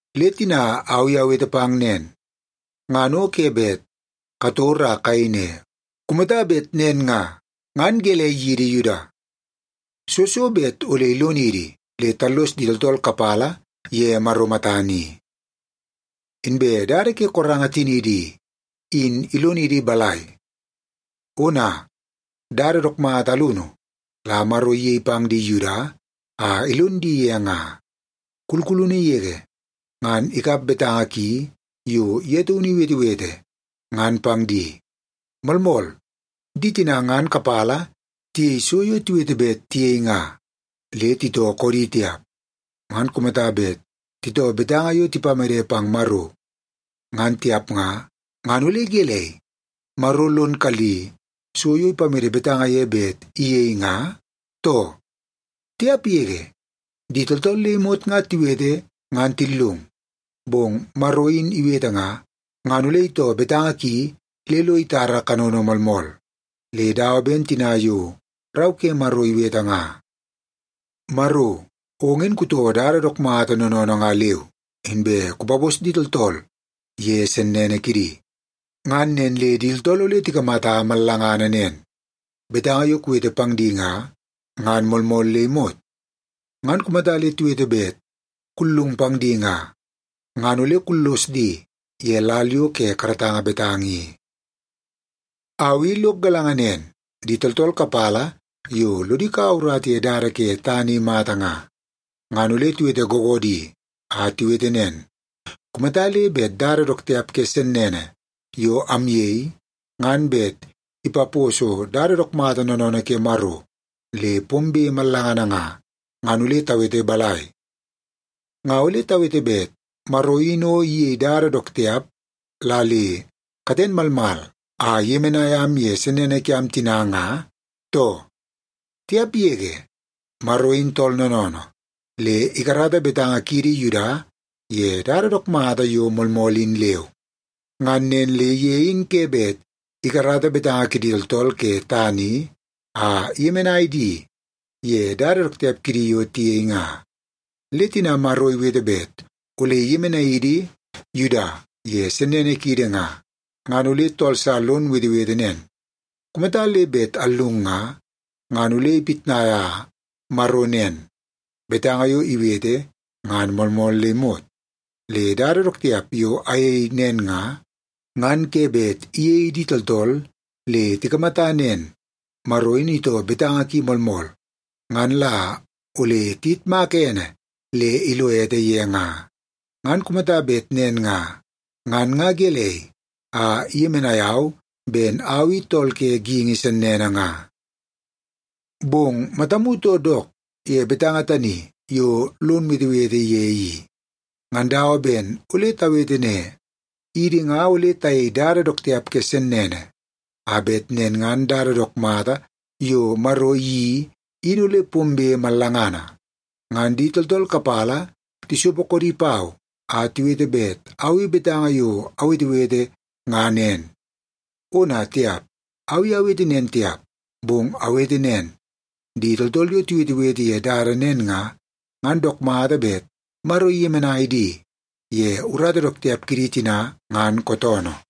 Le tina au i awete pang nen, ngan o ke bet kator a kayei ne, “Kumata bet nen nga, ngan gelei yidi Yuda? Soo so bet ole ilonidi le tallos di tooltool kapala ye Maro matana i? Inbe dada ke koranga tiniidi i, in ilonidi balai?” Ona, dada dook mata alunu la Maro iyei pang di Yuda a ilon di ye nga. Kulkulunu yege ngan ikap betanga ki yo ye taunu iwetewete, ngan pang di. Moolmool, di tina ngan kapala tiyei so yo tiwete bet tiyei nga, le titoo koodi tiap. Ngan kumata bet titoo betanga yo tipamede pang Maro, ngan tiap nga, ngan ole gelei, Maro lon kalli so yo ipamede betanga ye bet iyei nga, too? Tiap yege! Di tooltool le imot nga tiwete ngan tillung, bong Maro in iwete nga, ngan ole itoo betanga ki le lo itara kanono moolmool. Le dawa ben tina yo Rau ke Maro iwete nga, “Maro, ong in kutoo dada dook mata noonoonoo nga leu, inbe kupapos di tooltool ye sennene kidi. Ngan nen le di tooltool ole tikamata mallanga nen, betanga yo kuwete pang di nga, ngan moolmool le imot. Ngan kumata le tiwete bet kullung pang di nga, ngan ole kullos di ye lal yo ke karatanga betanga i.” Au i lok galanga nen, di tooltool kapala yo lodi kaua urata ye dada ke tana i mata nga, ngan ole tiwete googoodi a tiwete nen, “Kumata le bet dada dook tiap ke sennene yo amyei, ngan bet ipaposo dada dook mata noonoonoo ke Maro le pombe mallangana nga, ngan ole tawete balai? Nga ole tawete bet Maro in o iyei dada dook tiap la le katen malmal a iyemenai am ye sennene kiam tina nga, too?” Tiap yege! Maro in tool noonoonoo, le ikarata betanga kiidi Yuda ye dada dook mata yo moolmool in leu. Ngan nen le ye in ke bet ikarata betanga kidi tooltool ke tana i a iyemenai di ye dada dook tiap kidi yo tiyei nga. Le tina Maro iwete bet ole iyemenai idi Yuda ye sennene kiidi nga, ngan ole tool sa lon wetewete nen, “Kumata le bet allung nga, ngan ole ipitnaia Maro nen, betanga yo iwete ngan moolmool le imot. Le dada dook tiap yo ayei nen nga, ngan ke bet iyei di tooltool le tikamata nen, Maro in itoo betanga ki moolmool, ngan la ole tiyitmaka ene le ilo ete ye nga. Ngan kumata bet nen nga, ngan nga gelei a iyemenai au ben au i tool ke geingi sennene nga?” Bong matamu too dook ye betanga tani yo lon wetewete ye i. Ngan dawa ben ole tawete ne, “Idi nga ole tayei dada dook tiap ke sennene, a bet nen ngan dada dook mata yo Maro iyeii in ole pombe mallangana.” Ngan di tooltool kapala tisopo koodi pau a tiwete bet au i betanga yo awetewete nga nen. Ona tiap, au i awete nen tiap, bong awete nen, di tooltool yo tiwetewete ye dada nen nga, ngan dook mata bet Maro iyemenai di ye urata dook tiap kidi tina ngan kootoonoo.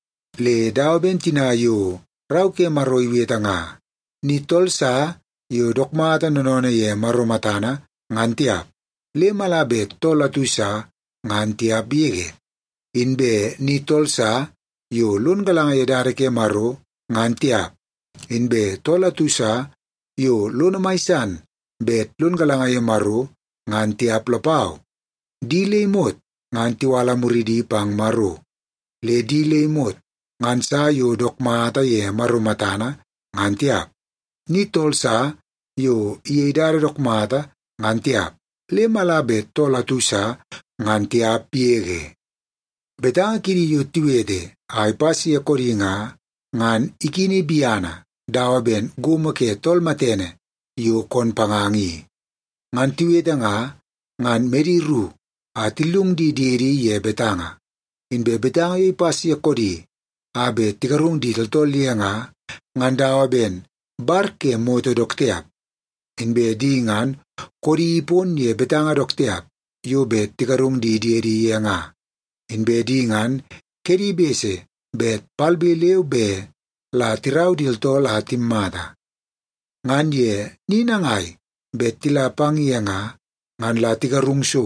Le dawa ben tina yo Rau ke Maro iwete nga, “Ni tool sa yo dook mata noonoonoo ye Maro matana, ngan tiap, le mala bet tool atu sa, ngan tiap yege. Inbe ni tool sa yo lon galanga ye dada ke Maro, ngan tiap. Inbe tool atu sa yo lono mai san bet lon galanga ye Maro, ngan tiap lapau. Di le imot ngan tiwala muridi pang Maro, le di le imot ngan sa yo dook mata ye Maro matana, ngan tiap. Ni tool sa yo iyei dada dook mata, ngan tiap, le mala bet tool atu sa, ngan tiap yege.” “Betanga kidi yo tiwete a ipas ye koodi nga, ngan ikini biana dawa ben gomo ke tool matene yo koon panganga i. Ngan tiwete nga, ngan medi ru a tillung di diedi ye betanga.” “Inbe betanga yo ipas ye koodi a bet tigarung di tooltool ye nga, ngan dawa ben bar ke moto dook tiap.” “Inbe di ngan koodi ipon ye betanga dook tiap yo bet tigarung di diedi ye nga.” “Inbe di ngan kedi bese bet palbe leu be la tirau di tooltool a timatamata. Ngan ye ni nangai bet tila pang ye nga, ngan la tigarung so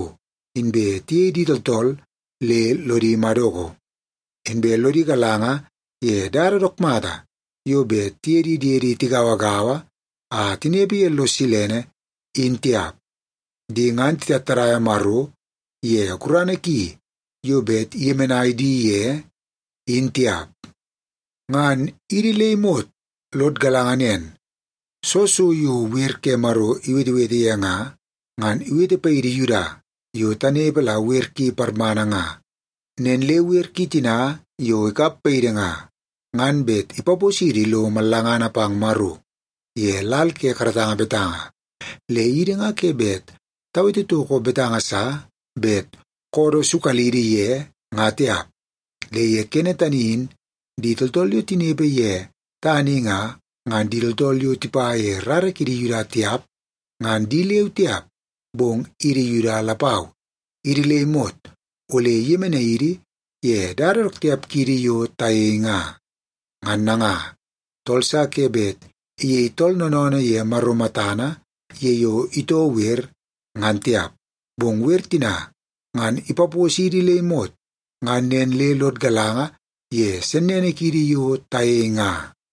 inbe tiyei di tooltool le lodi madoko. Inbe lodi galanga ye dada dook mata yo bet tiye di diedi tigauagaua a tinepe ye lo silene, in tiap.” “Di ngan titattadaia Maro ye gurana ki yo bet iyemenai di ye, in tiap.” Ngan idi le imot lod galanga nen, soo so yo wer ke Maro iwetewete ye nga, ngan iwete paidi Yuda yo tanepe la wer ki parmana nga. Nen le wer ki tina yo ikap paidi nga, ngan bet ipaposidi lo mallangana pang Maro ye lal ke karatanga betanga, le idi nga ke bet tawete toko betanga sa bet koodoo sukalidi ye nga tiap. Le ye kene tani in di tooltool yo tinepe ye tana i nga, ngan di tooltool yo tipa ye rara kidi Yuda tiap, ngan di leu tiap, bong idi Yuda lapau, idi le imot ole iyemenai idi ye dada dook tiap kiidi yo tayei nga. Ngan nanga, tool sa ke bet iyei tooltool noonoonoo ye Maro matana ye yo itoo wer, ngan tiap. Bong wer tina ngan ipaposidi le imot ngan nen le lod galanga ye sennene kiidi yo tayei nga.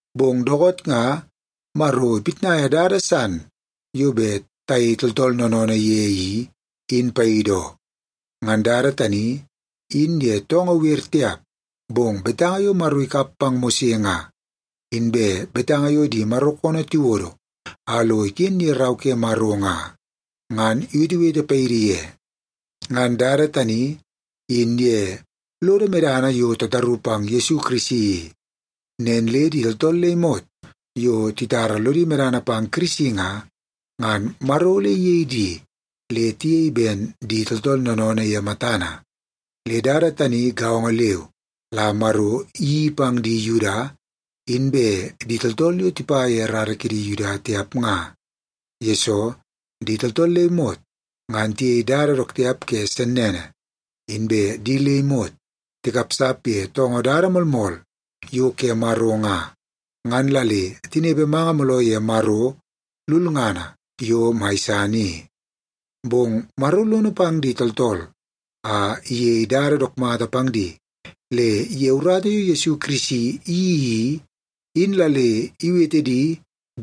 Bong dookoot nga, Maro ipitnaia dada san yo bet tayei tooltool noonoonoo ye i, in paidi oo. Ngan dada tani, in ye toongoo wer tiap, bong betanga yo Maro ikap pang Mose nga, inbe betanga yo di Maro koonoo tiwodo a lo iken ye Rau ke Maro nga, ngan iwetewete paidi ye. Ngan dada tani, in ye lodo medana yo tataru pang Yesu Kirisi i. Nen le di tooltool le imot yo titara lodi medana pang Kirisi nga, ngan Maro ole iyei di le tiyei ben di tooltool noonoonoo ye matana. Le dada tani gaongo leu la Maro iyeii pang di Yuda, inbe di tooltool yo tipa ye rara kidi Yuda tiap nga. Yesoo, di tooltool le imot ngan tiyei dada dook tiap ke sennene. Inbe di le imot tikapsap ye toongoo dada moolmool yo ke Maro nga, ngan la le tinepe manga mooloo ye Maro lulngana yo mai san i. Bong Maro lono pang di tooltool a iyei dada dook mata pang di, le ye urata yo Yesu Kirisi iyeii i, in la le iwete di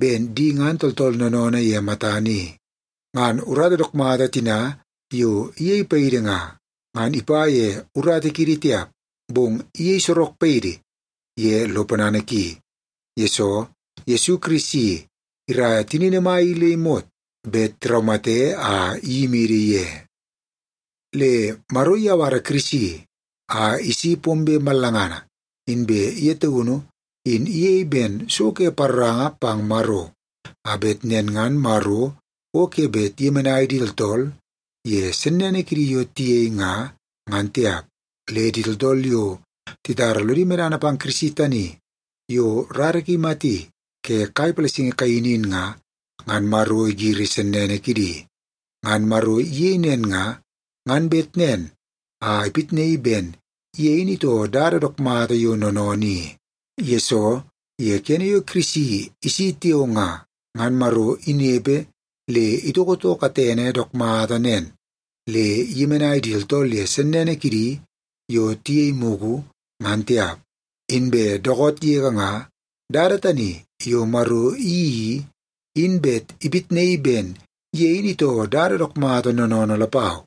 ben di ngan tooltool noonoonoo ye matana i. Ngan urata dook mata tina yo iyei paidi nga, ngan ipa ye urata kiidi tiap, bong iyei sorok paidi ye lo ponana ki, yesoo Yesu Kirisi iraia tinini mai i le imot bet tiraumate a iyimidi ye. Le Maro iyawara Kirisi a isi pombe mallangana, inbe ye taunu in iyei ben so ke paroranga pang Maro, a bet nen ngan Maro o ke bet iyemenai di tooltool ye sennene kidi yo tiyei nga, ngan tiap. Le di tooltool yo titara lodi medana pang Kirisi tani yo rara ki imati ke kai palasingi kaini in nga, ngan Maro igiri sennene kidi. Ngan Maro iyei nen nga, ngan bet nen a ipitnaii ben ye in itoo dada dook mata yo noonoonoo i. Yesoo, ye kene yo Kirisi isi tiao nga, ngan Maro inepe le itoko too katene dook mata nen le iyemenai di tooltool ye sennene kidi yo tiyei mugu, ngan tiap. Inbe dookoot yege nga, dada tani yo Maro iyeii i, in bet ipitnaii ben ye in itoo dada dook mata noonoonoo lapau.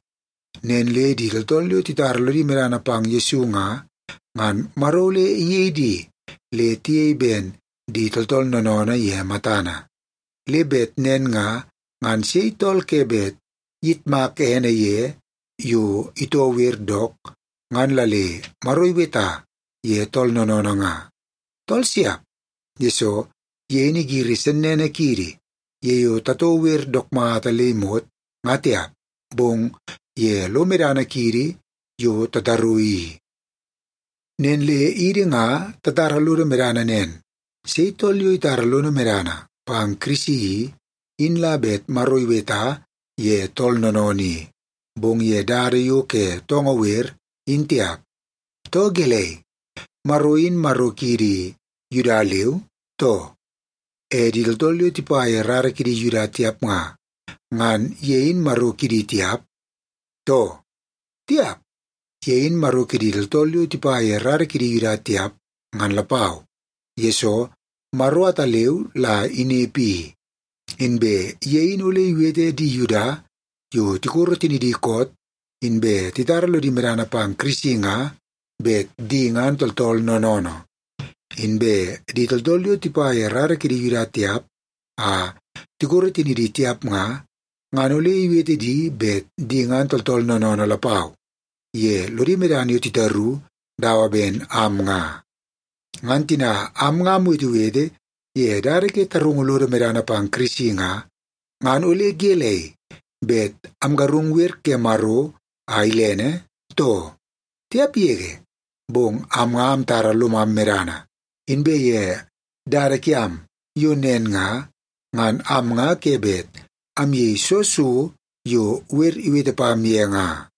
Nen le di tooltool yo titara lodi medana pang Yesu nga, ngan Maro ole iyei di le tiyei ben di tooltool noonoonoo ye matana. Le bet nen nga, ngan sei tool ke bet iyitmak ene ye yo itoo wer dook, ngan la le Maro iweta ye tool noonoonoo nga? Tool siap, yesoo ye in igiri sennene kiidi, ye yo tatoo wer dook mata le imot, nga tiap, bong ye lo medana kiidi yo tataru i. Nen le idi nga tatara lodo medana nen, sei tool yo itara lono medana pang Kirisi i, in la bet Maro iweta ye tool noonoonoo i. Bong ye dada yo ke toongoo wer, in tiap. Too gelei, Maro in Maro kiidi Yuda leu, too? E di tooltool yo tipa ye rara kidi Yuda tiap nga, ngan ye in Maro kidi tiap, too? Tiap, ye in Maro kidi tooltool yo tipa ye rara kidi Yuda tiap, ngan lapau, yesoo Maro ataleu la inepe i. Inbe ye in ole iwete di Yuda yo tikoro tinidi koot inbe titara lodi medana pang Kirisi nga, bet di ngan tooltool noonoonoo. Inbe di tooltool yo tipa ye rara kidi Yuda tiap a tikoro tinidi tiap nga, ngan ole iwete di bet di ngan tooltool noonoonoo lapau ye lodi medana yo titaru dawa ben am nga. Ngan tina am nga amwetewete ye dada ke tarungu lodo medana pang Kirisi nga, ngan ole gelei, bet amgarung wer ke Maro a ilene, too? Tiap yege! Bong am nga amtara lomam medana, inbe ye dada kiam yo nen nga, ngan am nga ke bet ayei soo so yo wer iwete pam ye nga.